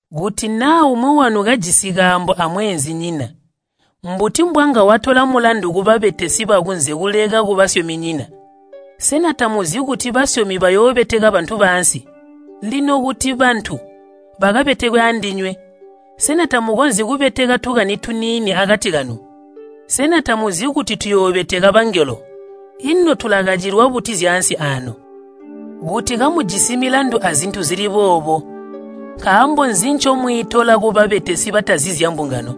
Kuti naa umwi wanu kajisi kaambo amweenzinyina, mbuti mbwanga watola mulandu kubabetesi bakunze kuleka kubasyominyina? Sena tamuzi kuti basyomi bayoobeteka bantu baansi? Lino kuti bantu bakabetekwe andinywe, sena tamukonzyi kubeteka tukani tuniini akati kanu? Sena tamuzi kuti tuyoobeteka bangelo? Ino tulakacilwa buti zyaansi aano? Kuti kamujisi milandu azintu zili boobo, nkaambo nzi ncomwiitola kubabetesi batazi zyambungano?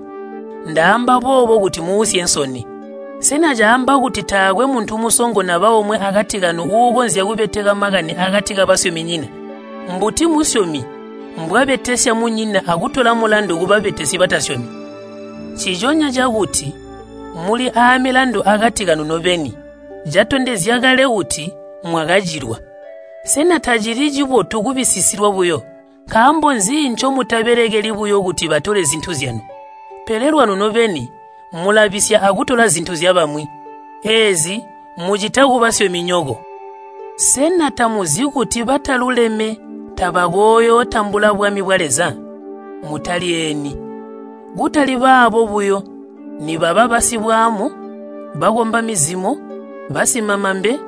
Ndaamba boobo kuti muusye nsoni. Sena caamba kuti taakwe muntu musongo naba omwe akati kanu uukonzya kubeteka makani akati kabasyominyina? Mbuti musyomi mbwabetesya munyina akutola mulandu kubabetesi batasyomi? Nciconya cakuti muli aamilandu akati kanu nobeni catondezya kale kuti mwakacilwa. Sena tacili cibotu kubisisilwa buyo? Nkaambo nzi ncomutabelekeli buyo kuti batole zintu zyanu? Pele lwanu nobeni mulabisya akutola zintu zyabamwi. Eezi mucita kubasyominyoko. Sena tamuzi kuti bataluleme tabakooyootambula bwami bwa Leza? Mutalyeeni, kutali baabo buyo nibaba basibwaamu, bakomba mizimo, basimamambe,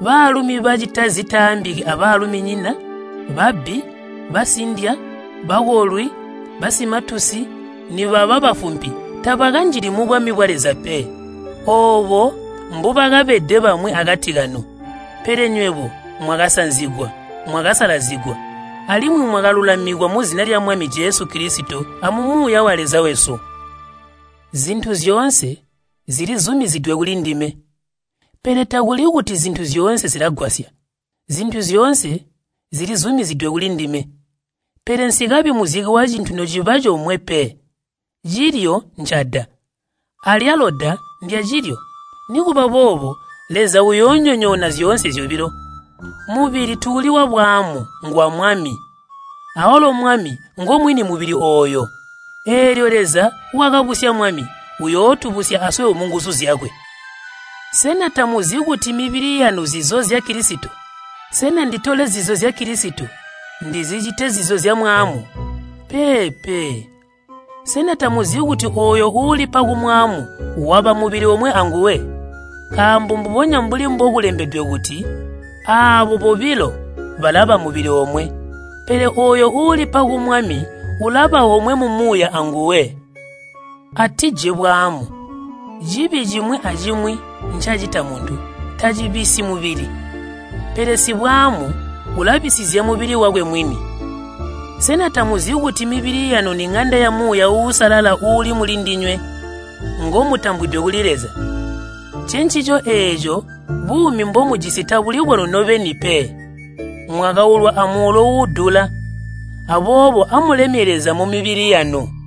baalumi bacita zitaambiki abaaluminyina, babbi, basindya, bakolwi, basimatusi, nibaba bafumpi tabakanjili mubwami bwa Leza pe. Oobo mbubakabede bamwi akati kanu. Pele nywebo mwakasanzigwa, mwakasalazigwa, alimwi mwakalulamikwa muzina lya Mwami Jesu Kilisito amu Muuya wa Leza wesu. “Zintu zyoonse zilizumizidwe kulindime,” pele takuli kuti zintu zyoonse zilagwasya. “Zintu zyoonse zilizumizidwe kulindime,” pele nsikabi muzike wacintu nociba comwe pe. “Cilyo ncada, alyalo da ndyacilyo,” nikuba boobo Leza uyoonyonyoona zyoonse zyobilo. Mubili tuuli wabwaamu, ngwa Mwami, awalo Mwami ngomwini mubili ooyo. Eelyo Leza wakabusya Mwami uyootubusya aswebo munguzu zyakwe. Sena tamuzi kuti mibili yanu nzizo zya Kilisito? Sena nditole zizo zya Kilisito, ndizicite zizo zyamwaamu? Peepe! Sena tamuzi kuti ooyo uulipa kumwaamu waba mubili omwe anguwe? Nkaambo mbubonya mbuli mbokulembedwe kuti, “Aabo bobilo balaba mubili omwe.” Pele ooyo uulipa ku Mwami ulaba omwe mumuuya anguwe. Amuleke bwaamu. Cibi cimwi acimwi ncacita muntu tacibisyi mubili, pele sibwaamu ulabisizya mubili wakwe mwini. Sena tamuzi kuti mibili yanu niŋanda ya Muuya Uusalala uuli mulindinywe, ngomutambwide kuli Leza? Ncencico eeco buumi mbomujisi tabuli bwanu nobeni pe. Mwakaulwa amuulo uudula. Aboobo amulemye Leza mumibili yanu.